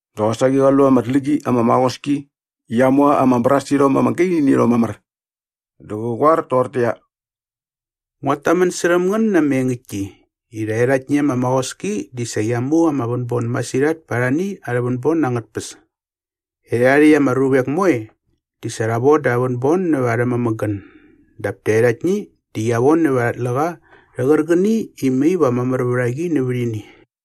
Dä qosaqi qa lu ama tlä qi ama maqoski i qia mu ama brasirhom ama gaini nä irhom mamär. Dä qä qoar toqortäqyia, “Nguat tamän särhäm ngän na ama engäktki i rhaerhaktni ama maqoski di sa qia mu ama vänbon masirhat pa arhani arhä vänbon angät tpäs. Erhärha rhäkt ama ruvek moe di sa rha voda arhä vänbon nävät arhä mämägän dap taerhaktni di qia von nävät arha tläqa rhä qärqäni i mai va mamär vät a qi nävät ini.”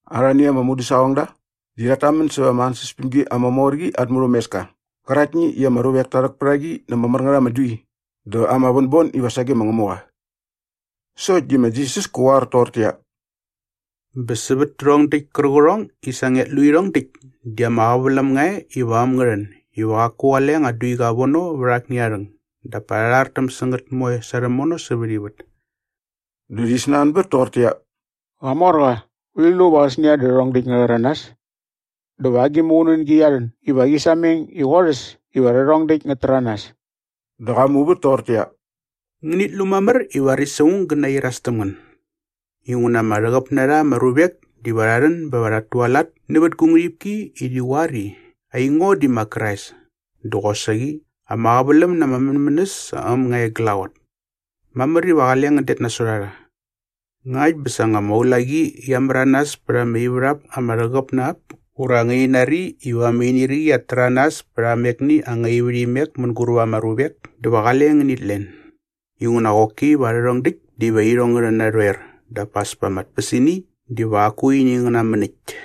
Arhani ama mudäsaqongda di rhat tamän sävät ama ansäspämgi ama mor qi at murhämeska qäraktni i ama ruvek ta rhäk pät a qi na ama mär ngät ama dui dä ama vänbon iva sage ma Ngämuqa. Sokt di ma Jisas kä qoar toqortäqyia, “Bä sävät tärhong däkt kärqärhongni i sa ngiat lu irhong däkt di ama qäväläm nga e iva äm ngä rhän iva qaku qale anga duiqa vono vät akni aa rhäng dap pa rha rhartäm sä ngät moe sa rhämono sävät ivät.” Dä rhi snanbät toqortäqyia, “Qamorqa, urhi lu va qäsnia dä rhärhong däkt ngä rhäranas? Dä va agi muqunängi qia rhän iva qi sameng i qorhäs iva rhärhong däkt ngät täranas?” Dä qa muvät toqortäqyia, “Ngänit lu mamär i varis aung gä nairas täm ngän. Inguna ama rhäqäp na rha ama ruvek diva rha rhän bä va rhat tualat nävät gu ngärhipki i rhi qoar i, ‘Aingo di ma Krais!’ dä qosaqi ‘Ama qäväläm na aa mänmänäs sa äm nga e glaqot.’ Mamär iva qale ngän det nasot a rha. Ngakt bä nga sa ama ulaqi qia märanas pät ama ivärhap ama rhäqäp na ap ura ngäni nari iva ama inirqi qiat täranas pät amekni anga ivärhimek mänguräp ama ruvek dä va qale ngänit len. Inguna qoki va rhärhong däkt diva irhong ngä rhän narhoer dap as pa ama tpäsini diva qaku ini ngä namän äkt.”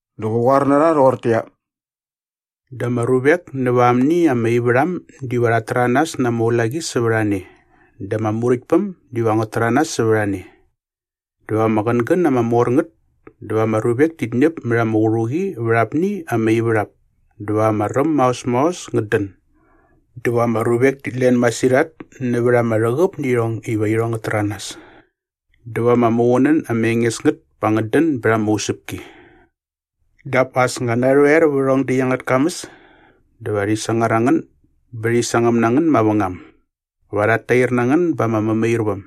Dä qä qoar na rha rhoqortäqyia, “Dä ama ruvek näva amni ama ivärham diva rhat täranas na ama ulaqi sävät a ne dä ama muräktpäm diva ngät täranas sävät a ne. Dä va ama qängän ama mor ngät dä va ama ruvek tit ñäp mät ama qärhuqi vät apni ama ivärhap dä va ama räm maos maos ngät dän. Dä va ama ruvek tit len masirhat nävät ama rhäqäp nä irhong iva irhong ngät täranas. Dä va ama muqunän ama enges ngät pa ngät dän bät ama usäpki.” “Dap as nga narhoer vä rhärhong däkt angät kamäs dä va rhi sangar a ngän bä rhi sangäm na ngän mavängam. Va rhat tair na ngän ba ama mämairväm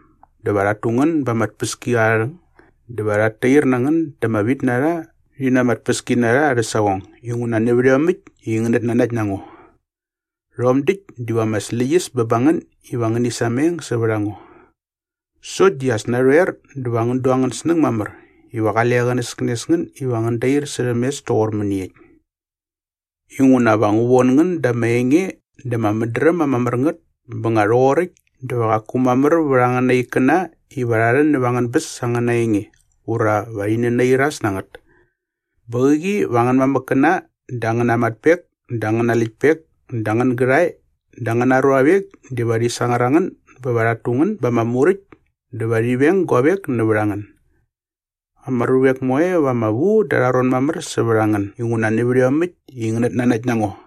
dä va rhat tu ngän ba ama tpäskiarharhäng dä va rhat tair na ngän da ama vitnarha rhi na ama tpäskinarha arhä saqong inguna nävät iomäkt i ngänät nanakt na ngo. Rhom däkt diva ama släqyäs bä ba ngän ivakt iva ngäni sameng sävät a ngo. “Sokt di as narhoer dä va ngän du angän snäng mamär iva qale qänäskänes ngän iva ngän dair särhäm mes toqor mäniekt. Inguna va ngu von ngän da ama enge dä ama mädräm ama mär ngät bä nga rhoqoräkt dä va qaku mamär vät angäna ikkäna iva rha rhän näva angän bäs sa angäna enge ura va rhi nänairas na ngät. Bä qäqi va angän mamäkkäna dä angäna matpek dä angäna läktpek dä angän gärhae dä angäna ruavek diva rhi sangar a ngän bä va rhat tu ngän ba ama muräkt dä va rhi veng guavek nävät a ngän. Ama ruvek moe va ama vu da arha ron mamär sävät a ngän inguna nävät iomäkt i ngänät nanakt na ngo.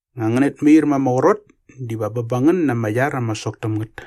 Nga ngänät mair ma ama qrot diva bä ba ngän na ama iar ama sok täm ngät.”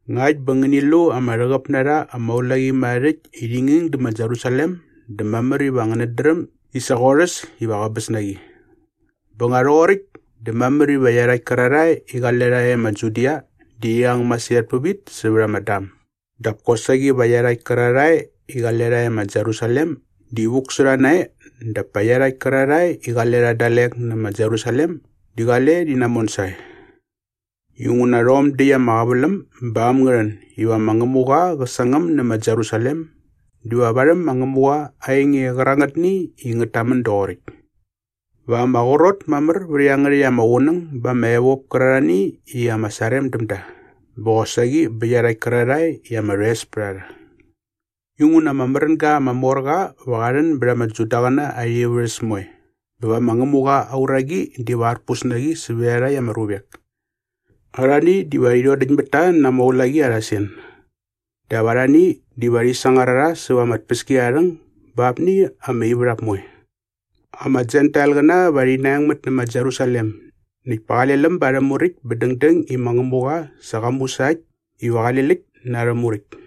“Ngakt bä nga ngäni lu ama rhäqäp na rha ama ulaqimärharhärhäkt i rhi nging dä ma Jerusalem dä mamär iva ngänät dräm i sa qorhäs iva qäbäs na qi. Bä nga rhoqoräkt dä mamär iva iarhakt kärarhae i qale rha e ma Judia di rhi ang masirhat pävit sävät ama dam dap kosaqi va iarhakt kärarhae i qale rha e ma Jerusalem di vuk sä rha nae dap pa iarhakt kärarhae i qale rha dalek nä ma Jerusalem di qale rhi namon sae. Inguna rhom däkt ama qäväläm ba äm ngä rhän iva ma Ngämuqa qä sangäm nä ma Jerusalem diva varhäm ma Ngämuqa aa enge qärangätni i ngät tamän doqoräkt. Va ama qrot mamär vät iangärhäkt ama qunäng ba ama evop kärarhani i ama sarem däm da bä qosaqi bä iarhakt kärarhae i ama rhoes pät a rha. Inguna ama märänga ama mor qa va qa rhän bät ama Judaqäna arha ivärhäs moe bä va ma Ngämuqa aa uraqi diva arpus na qi sävät iarhakt ama ruvek. Arhani diva rhi rhodäkt mät ta na ulaqi arha sen. Dap arhani diva rhi sangar a rha säva ama tpäskiarharhäng ba apni ama ivärhap moe. Ama Jentailqäna va rhi naengmät nä ma Jerusalem näkt pa qale läm ba arhä muräkt bä dängdäng i ma Ngämuqa sa qa mu sa äkt iva qale läkt na arhä muräkt.”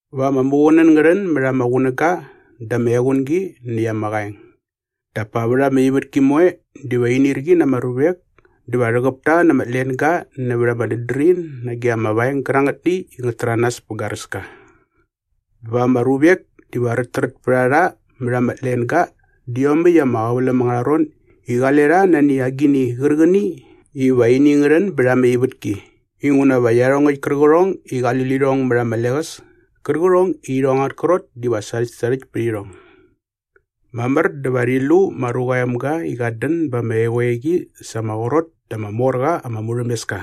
“Va ama muqunän ngä rhän mät ama qunäga dä ama equngi näkt ama qaeng. Dap pa vät ama ivätki moe diva inirqi na ama ruvek dä va rhäqäp ta na ama tlenga nävät ama dädrin nage ama vaeng gärangätni i ngät täranas pä garäska. Bä va ama ruvek diva räträt pät a rha mät ama tlenga dä iomäkt ama qäväläm angärha ron i qale rha nani agini qärqäni va ini ngä rhän bät ama ivätki inguna va iarhongäkt kärqärhong i qali lirhong mät ama leqäs kärqärhong i irhong angät krot diva sarhäktsarhäkt pät irhong. Mamär dä va rhi lu ma Ruqa aa Emga i qat dän ba ama eqoeqi sa ama qrot dä ama mor qa ama murhämeska.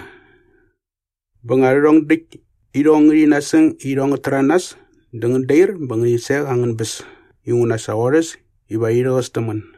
Bä nga rhärhong däkt irhong ngärhi nasäng iva irhong ngät täranas dä ngän dair bä va ngäni sek angän bäs inguna sa qorhäs iva rhi rhäqäs täm ngän.”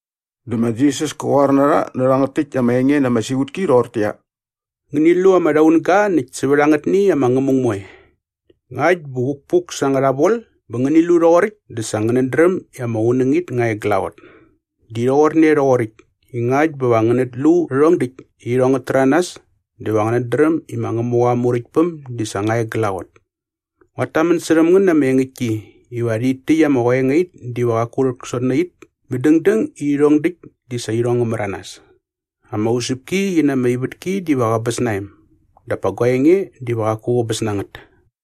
Dä ma Jisas kä qoar na rha nä rhangät täkt ama enge na ama siqutki rhoqortäqyia, “Ngäni lu ama rhaunga näkt sävät angät ama ngämung moe. Ngakt bä vukpuk sa angärha vol bä ngäni lu rhoqoräkt dä sa ngänät dräm i ama qunängit nga e glaqot. Di rhoqorne rhoqoräkt i ngakt bä va ngänät lu rhärhong däkt i irhong ngät täranas dä va ngänät dräm i ma Ngämuqa aa Muräktpäm di sa nga e glaqot.” “Nguat tamän särhäm ngän na ama engäktki iva rhit täkt ama qoengait diva qaku rhäksot nä it bä dängdäng i rhärhong däkt di sa irhong ngä märanas. Ama usäpki qi na ama ivätki diva qäbäs na em dap pa gua enge diva qaku qäbäs na ngät.”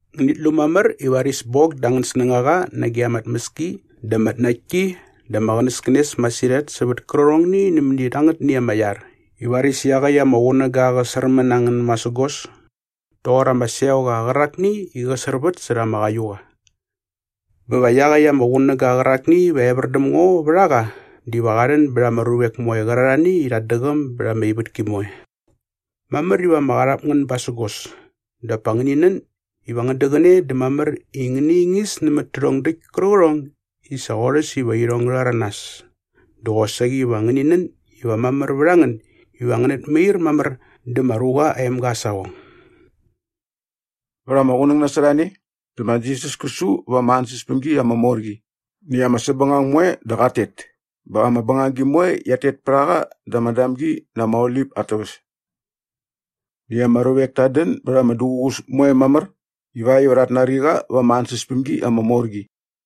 “Ngänit lu mamär i varis bok da angän snängaqa nage ama tmäski dä ama tnaktki dä ama qänäskänes masirhat sävät kärqärhongni nämäni rhangätni ama iar i varis iaqäkt ama qunäga qä särmän na ngän masägos toqor ama seoqa qärakni i qä särvät särha ama qaiuqa. Bä va iaqäkt ama qunäga qärakni iva evär däm ngo vät a qa diva qa rhän bät ama ruvek moe qärarhani i rhat däqäm bät ama ivätki moe. Mamär iva ama qarhap ngän basägos dap pa ngäni nän iva ngän däqäne dä mamär i ngäni ingis nämät tärhong däkt kärqärhongni i sa qorhäs iva irhong ngä rhäranas dä qosaqi va ngäni nän iva mamär vät a ngän iva ngänät mair mamär dä ma Ruqa aa Emga aa saqong.” Vät ama qunäng nasot a ne dä ma Jisas kä su va ama ansäspämgi ama mor qi näkt ama säpbängang moe dä qat tet bä ama bängagi moe qiat tet pät a qa da ama Damgi na ama Olip at täväs. Näkt ama ruvek tat dän bät ama duququs moe mamär ivakt iva rhat nari qa va ama ansäspämgi ama mor qi.